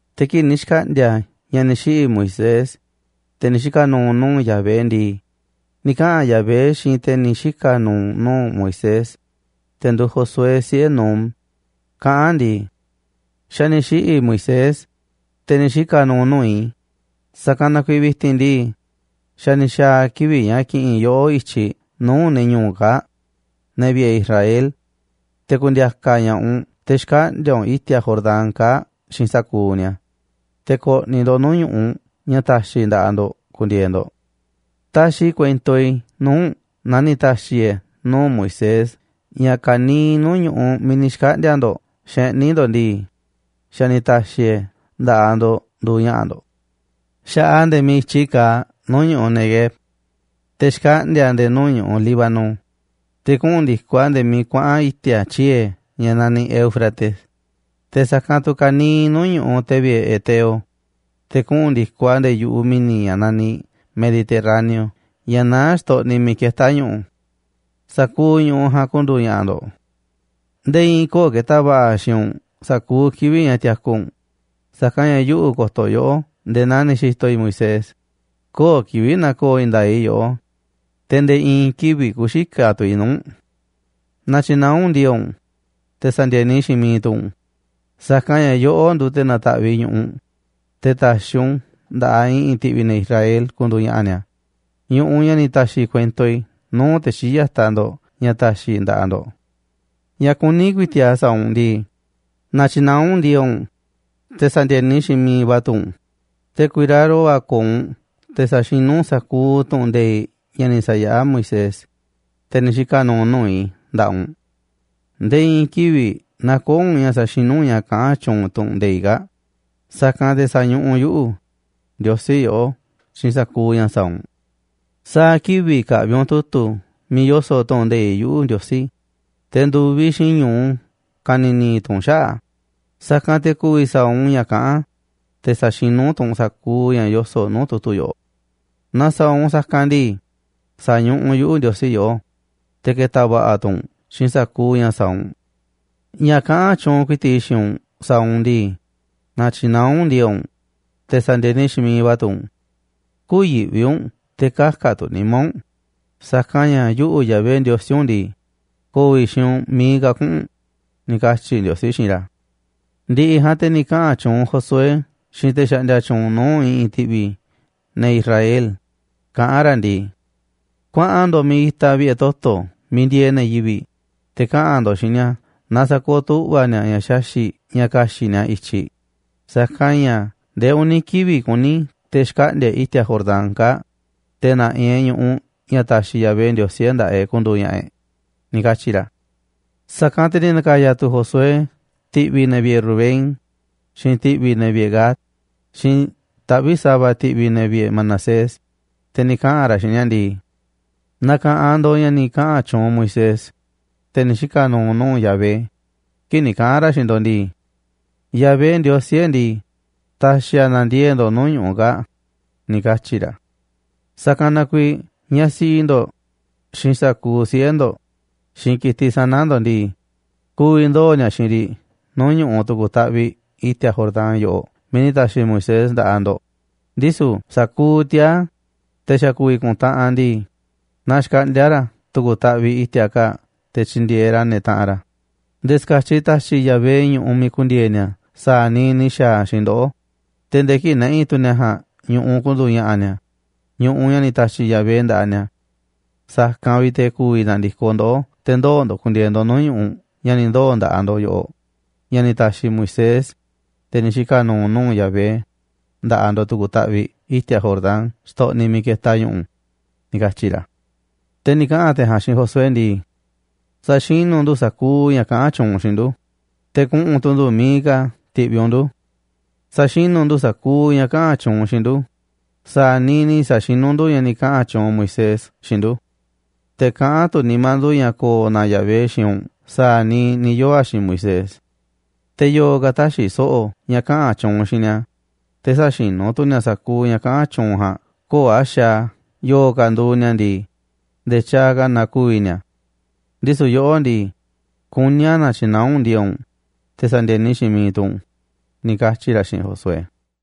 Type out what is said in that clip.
Te̱ kii̱ꞌ ni̱ xkaꞌndi̱a̱ ña̱ ni̱ xiꞌi̱ Moisés, te̱ ni̱ xika̱ nu̱u̱ nuu̱ꞌ Yahvé ndii, ni̱ kaꞌa̱n Yahvé xiinꞌ te̱ ni̱ xika̱ nu̱u̱ nuu̱ꞌ Moisés, te̱ nduuꞌ Josué, siꞌe̱ Nun, kaꞌán a̱ ndii: ―Xa̱ ni̱ xiꞌi̱ Moisés, te̱ ni̱ xika̱ nu̱u̱ nuu̱ꞌ i̱, sa̱kanꞌ na kuiiꞌ vi̱ti̱n ndii, xa̱ ni̱ xa̱a̱ kivi̱ꞌ ña̱ ki̱ꞌi̱n yoꞌó i̱tyiꞌ nuu̱ꞌ ne̱ ñu̱u̱ u̱nꞌ kaa̱ꞌ, ne̱ vi̱ꞌe̱ Israel, te̱ ku̱ndi̱a̱ka̱ ña̱ꞌaꞌ u̱nꞌ te̱ xkaꞌndi̱a̱ u̱nꞌ i̱ti̱a̱ Jordán kaa̱ꞌ xiinꞌ sa̱kuuꞌ ni̱a̱, te̱ ko̱ꞌni̱ ndo̱ꞌ nuu̱ꞌ ñu̱ꞌuꞌ ña̱ ta̱xi̱ i̱ nda̱ꞌaꞌ ndo̱ꞌ ku̱ndi̱e̱e̱ ndo̱ꞌ. Taxiꞌ i̱ kuento i̱ nuu̱ꞌ u̱nꞌ naa ni̱ ta̱xi̱ i̱ e̱ nuu̱ꞌ Moisés ña̱ ka̱niiꞌ nuu̱ꞌ ñu̱ꞌuꞌ miiꞌ ni̱ xkaꞌndi̱a̱ ndo̱ꞌ xeꞌní ndo̱ꞌ ndii, xa̱ ni̱ ta̱xi̱ i̱ e̱ nda̱ꞌaꞌ ndo̱ꞌ nduuꞌ ña̱ꞌa̱ ndo̱ꞌ. Xa̱ꞌaꞌ a̱ nde̱e̱ miiꞌ i̱tyi kaaꞌ nuu̱ꞌ ñu̱ꞌuꞌ Neguev, te̱ xkaꞌndi̱a̱ a̱ nde̱e̱ nuu̱ꞌ ñu̱ꞌuꞌ Líbano, te̱ kuꞌu̱n ndi̱koꞌ a̱ nde̱e̱ miiꞌ kuaꞌa̱n i̱ti̱a̱ tyiee̱ ña̱ naniꞌ Éufrates, te̱ sa̱kanꞌ tu̱ ka̱niiꞌ nuu̱ꞌ ñu̱ꞌuꞌ ne̱ vi̱ꞌe̱ heteo, te̱ kuꞌu̱n ndi̱koꞌ a̱ nde̱e̱ yu̱ꞌuꞌ mi̱ni̱ ña̱ naniꞌ Mediterráneo ña̱ naá xtoꞌniꞌ miiꞌ ketá ñu̱ꞌu̱. Sa̱kuuꞌ ñu̱ꞌuꞌ ja̱a̱nꞌ ku̱ndu̱u̱ ña̱ꞌa̱ ndo̱ꞌ. Nde̱e̱ i̱i̱n köo̱ꞌ ke̱ta̱ va̱ꞌa̱ xiinꞌ u̱nꞌ sa̱kuuꞌ kivi̱ꞌ ña̱ tiaku u̱nꞌ, sa̱kanꞌ ña̱ yuꞌu̱ ko̱to̱ yoꞌó nde̱e̱ naa ni̱ xi̱to̱ i̱ Moisés, köo̱ꞌ kivi̱ꞌ na̱ko̱o̱ i̱i̱n nda̱a̱ꞌ i̱ yoꞌó, te̱ nde̱e̱ i̱i̱n kivi̱ꞌ kü̱xikaꞌ tu̱ i̱ nuu̱ꞌ u̱nꞌ. ’Na̱tyi̱naá u̱nꞌ ndi̱e̱e̱ꞌ u̱nꞌ, te̱ sa̱ndi̱e̱ni xiinꞌ mi̱iꞌ tu̱ u̱nꞌ, sa̱kanꞌ ña̱ yoꞌó nduuꞌ te̱ na̱ta̱ꞌviꞌ ñu̱ꞌuꞌ, te̱ ta̱xi̱ u̱nꞌ u̱n nda̱ꞌaꞌ i̱ꞌi̱n ti̱ꞌvi̱ ne̱ Israel ku̱ndu̱u̱ ña̱ꞌa̱ ni̱a̱, ñu̱ꞌuꞌ ña̱ ni̱ ta̱xi̱ i̱ kuento i̱ nuu̱ꞌ te̱ xii̱ꞌ ya̱taꞌ ndo̱ꞌ ña̱ ta̱xi̱ i̱ nda̱ꞌaꞌ ndo̱ꞌ. Ña̱ kuní ku̱i̱ti̱ꞌ a̱ sa̱a̱ u̱nꞌ ndii, na̱tyi̱naá u̱nꞌ ndi̱e̱e̱ꞌ u̱nꞌ, te̱ sa̱ndi̱e̱ni xiinꞌ mi̱iꞌ va̱ tu̱ u̱nꞌ. Te̱ ku̱i̱raro va̱ ko̱o̱ u̱nꞌ te̱ sa̱xinú u̱nꞌ sa̱kuuꞌ tu̱ꞌu̱n nde̱iꞌ ña̱ ni̱ sa̱yaꞌá Moisés, te̱ ni̱ xika̱ nu̱u̱ nuu̱ꞌ i̱, nda̱ꞌaꞌ u̱nꞌ. Nde̱e̱ i̱i̱n kivi̱ꞌ nä̱ko̱o̱ u̱nꞌ ña̱ sa̱xinú u̱nꞌ ña̱ kaꞌán tyuunꞌ tu̱ꞌu̱n nde̱iꞌ kaa̱ꞌ, sa̱kanꞌ te̱ sa̱ñuꞌuꞌ yuꞌu̱, Ndiosí, yoꞌó xiinꞌ sa̱kuuꞌ ña̱ sa̱a̱ u̱nꞌ. Sa̱a̱ kivi̱ꞌ ka̱ꞌvi̱ u̱nꞌ tu̱tu̱ miiꞌ yoso̱ꞌ tu̱ꞌu̱n nde̱iꞌ yuꞌu̱, Ndiosí, te̱ ndu̱viꞌ xiinꞌ ñu̱u ka̱ni̱ni̱ tu̱ u̱nꞌ xaꞌa̱ꞌ a̱, sa̱kanꞌ te̱ ku̱vi̱ sa̱a̱ u̱nꞌ ña̱ kaꞌán a̱, te̱ sa̱xinú tu̱ u̱nꞌ sa̱kuuꞌ ña̱ yoso̱ꞌ nuu̱ꞌ tu̱tu̱ yoꞌoꞌ. Naaꞌ sa̱a̱ u̱nꞌ sa̱kanꞌ ndii, sa̱ñuꞌuꞌ yuꞌu̱, Ndiosí, yoꞌó, te̱ ke̱ta̱ va̱ꞌa̱ tu̱ u̱nꞌ xiinꞌ sa̱kuuꞌ ña̱ sa̱a̱ u̱nꞌ. Ña̱ kaꞌán tyuunꞌ ku̱i̱ti̱ꞌ i̱ xiinꞌ u̱nꞌ sa̱a̱ u̱nꞌ ndii, na̱tyi̱naá u̱nꞌ ndi̱e̱e̱ꞌ u̱nꞌ, te̱ sa̱ndi̱e̱ni xiinꞌ mi̱iꞌ va̱ tu̱ u̱nꞌ. Kü̱yi̱ꞌvi u̱nꞌ te̱ kä̱ka̱ tu̱ nimá u̱nꞌ, sa̱kanꞌ ña̱ yuꞌu̱, Yahvé Ndiosí u̱nꞌ ndii, ko̱o̱ i̱ xiinꞌ u̱nꞌ miiꞌ ka̱ kuꞌu̱n u̱nꞌ ―ni̱ katyi̱ Ndiosí xiinꞌ ra̱. Ndi̱ꞌi̱ ja̱a̱nꞌ te̱ ni̱ kaꞌa̱n tyuunꞌ Josué xiinꞌ te̱ xaꞌndia tyuunꞌ nuu̱ꞌ i̱ꞌi̱n ti̱ꞌvi̱ ne̱ Israel, kaꞌán ra̱ ndii: ―Kuaꞌan ndo̱ꞌ miiꞌ itaꞌ vi̱ꞌe̱ toto̱ miiꞌ ndieeꞌ ne̱ yivi̱ꞌ, te̱ kaꞌa̱n ndo̱ꞌ xiinꞌ ni̱a̱ na sa̱kooꞌ tu̱ꞌva̱ ni̱a̱ ña̱ xaxi̱ꞌ ña̱ ka̱xi̱ꞌ ni̱a̱ i̱tyiꞌ, sa̱kanꞌ ña̱ ndee uni̱ kivi̱ꞌ kuní te̱ xkaꞌndi̱a̱ e̱ꞌ i̱ti̱a̱ Jordán kaa̱ꞌ, te̱ na̱ꞌi̱ e̱ꞌ ñu̱ꞌuꞌ ña̱ ta̱xi̱ Yahvé Ndiosí e̱ꞌ nda̱ꞌaꞌ e̱ꞌ ku̱ndu̱u̱ ña̱ꞌa̱ e̱ꞌ ―ni̱ katyi̱ ra̱. Sa̱kanꞌ te̱ ni̱ na̱ka̱ya̱ tu̱ Josué ti̱ꞌvi̱ ne̱ vi̱ꞌe̱ Rubén, xiinꞌ ti̱ꞌvi̱ ne̱ vi̱ꞌe̱ Gad, xiinꞌ taꞌvi̱ꞌ sa̱va̱ ti̱ꞌvi̱ ne̱ vi̱ꞌe̱ Manasés, te̱ ni̱ kaꞌa̱n ra̱ xiinꞌ ni̱a̱ ndii: ―Na̱ka̱ꞌanꞌ ndo̱ꞌ ña̱ ni̱ kaꞌa̱n tyuunꞌ Moisés, te̱ ni̱ xika̱ nu̱u̱ nuu̱ꞌ Yahvé, kii̱ꞌ ni̱ kaꞌa̱n ra̱ xiinꞌ ndo̱ꞌ ndii: “Yahvé, Ndiosí e̱ꞌ ndii, ta̱xi̱ a̱ na̱ndiee̱ꞌ ndo̱ꞌ nuu̱ꞌ ñu̱ꞌuꞌ kaa̱ꞌ”, ni̱ katyi̱ ra̱. ’Sa̱kanꞌ na kuiiꞌ ñaꞌ siꞌi ndo̱ꞌ, xiinꞌ sa̱kuuꞌ siꞌe̱ ndo̱ꞌ, xiinꞌ ki̱tiꞌ sana̱ ndo̱ꞌ ndii, ku̱vi̱ ndoo̱ ni̱a̱ xiinꞌ riꞌ nuu̱ꞌ ñu̱ꞌuꞌ tu̱ku̱ taꞌviꞌ i̱ti̱a̱ Jordán yoꞌoꞌ miiꞌ ni̱ ta̱xi̱ Moisés nda̱ꞌaꞌ ndo̱ꞌ, ndisu̱ sa̱kuuꞌ tiaa̱, te̱ xa̱ ku̱vi̱ ku̱ntaꞌanꞌ ndii, na xkaꞌndi̱a̱ ra̱ tu̱ku̱ taꞌviꞌ i̱ti̱a̱ kaa̱ꞌ te̱ tyi̱ndi̱e̱eꞌ ra̱ ne̱ taꞌanꞌ ra̱, nde̱e̱ ska̱tyiꞌ ta̱xi̱ Yahvé ñu̱ꞌuꞌ miiꞌ ku̱ndi̱e̱e̱ ni̱a̱ sa̱a̱ ni̱ xa̱a̱ a̱ xiinꞌ ndoꞌó, te̱ nde̱e̱ kii̱ꞌ na̱ꞌi̱ tu̱ ne̱ ja̱a̱nꞌ ñu̱ꞌuꞌ ku̱ndu̱u̱ ña̱ꞌa̱ ni̱a̱, ñu̱ꞌuꞌ ña̱ ni̱ ta̱xi̱ Yahvé nda̱ꞌaꞌ ni̱a̱. Sa̱kanꞌ vi̱ꞌ te̱ ku̱vi̱ na̱ndi̱koꞌ ndoꞌó te̱ ndoo̱ ndo̱ꞌ ku̱ndi̱e̱e̱ ndo̱ꞌ nuu̱ꞌ ñu̱ꞌuꞌ ña̱ ni̱ ndoo̱ nda̱ꞌaꞌ ndo̱ꞌ yoꞌoꞌ, ña̱ ni̱ ta̱xi̱ Moisés, te̱ ni̱ xika̱ nu̱u̱ nuu̱ꞌ Yahvé, nda̱ꞌaꞌ ndo̱ꞌ tu̱ku̱ taꞌviꞌ i̱ti̱a̱ Jordán xtoꞌniꞌ miiꞌ ketaꞌ ñu̱ꞌu̱ ―ni̱ katyi̱ ra̱. Te̱ ni̱ kaꞌa̱n te̱ ja̱a̱nꞌ xiinꞌ Josué ndii: ―Sa̱xinu̱ ndu̱ sa̱kuuꞌ ña̱ kaꞌán tyuunꞌ u̱nꞌ xiinꞌ ndu̱, te̱ kuꞌu̱n tu̱ ndu̱ miiꞌ ka̱ ti̱ꞌviꞌ u̱nꞌ ndu̱. Sa̱xinu̱ ndu̱ sa̱kuuꞌ ña̱ kaꞌa̱n tyuunꞌ u̱nꞌ xiinꞌ ndu̱ sa̱a̱ niiꞌ ni̱ sa̱xinú ndu̱ ña̱ ni̱ kaꞌa̱n tyuunꞌ Moisés xiinꞌ ndu̱. Te̱ kaꞌán tu̱ nimá ndu̱ ña̱ ko̱o̱ na Yahvé xiinꞌ u̱nꞌ sa̱a̱ niiꞌ ni̱ yoo̱ a̱ xiinꞌ Moisés. Te̱ yo̱o̱ ka̱ tä̱xi̱ so̱ꞌo̱ ña̱ kaꞌa̱n tyuunꞌ u̱nꞌ xiinꞌ ni̱a̱, te̱ sä̱xinú tu̱ ni̱a̱ sa̱kuuꞌ ña̱ kaꞌa̱n tyuunꞌ u̱nꞌ ja̱a̱nꞌ, köo̱ꞌ a̱ xaaꞌ a̱ yo̱o̱ ka̱ nduuꞌ ni̱a̱ ndii, nde̱e̱ tyaaꞌ ka̱ na ku̱vi̱ ni̱a̱. Ndisu̱ yoꞌó ndii, kuní a̱ na̱tyi̱naá u̱nꞌ ndi̱e̱e̱ꞌ u̱nꞌ, te̱ sa̱ndi̱e̱ni xiinꞌ miiꞌ tu̱ u̱nꞌ ―ni̱ katyi̱ ra̱ xiinꞌ Josué.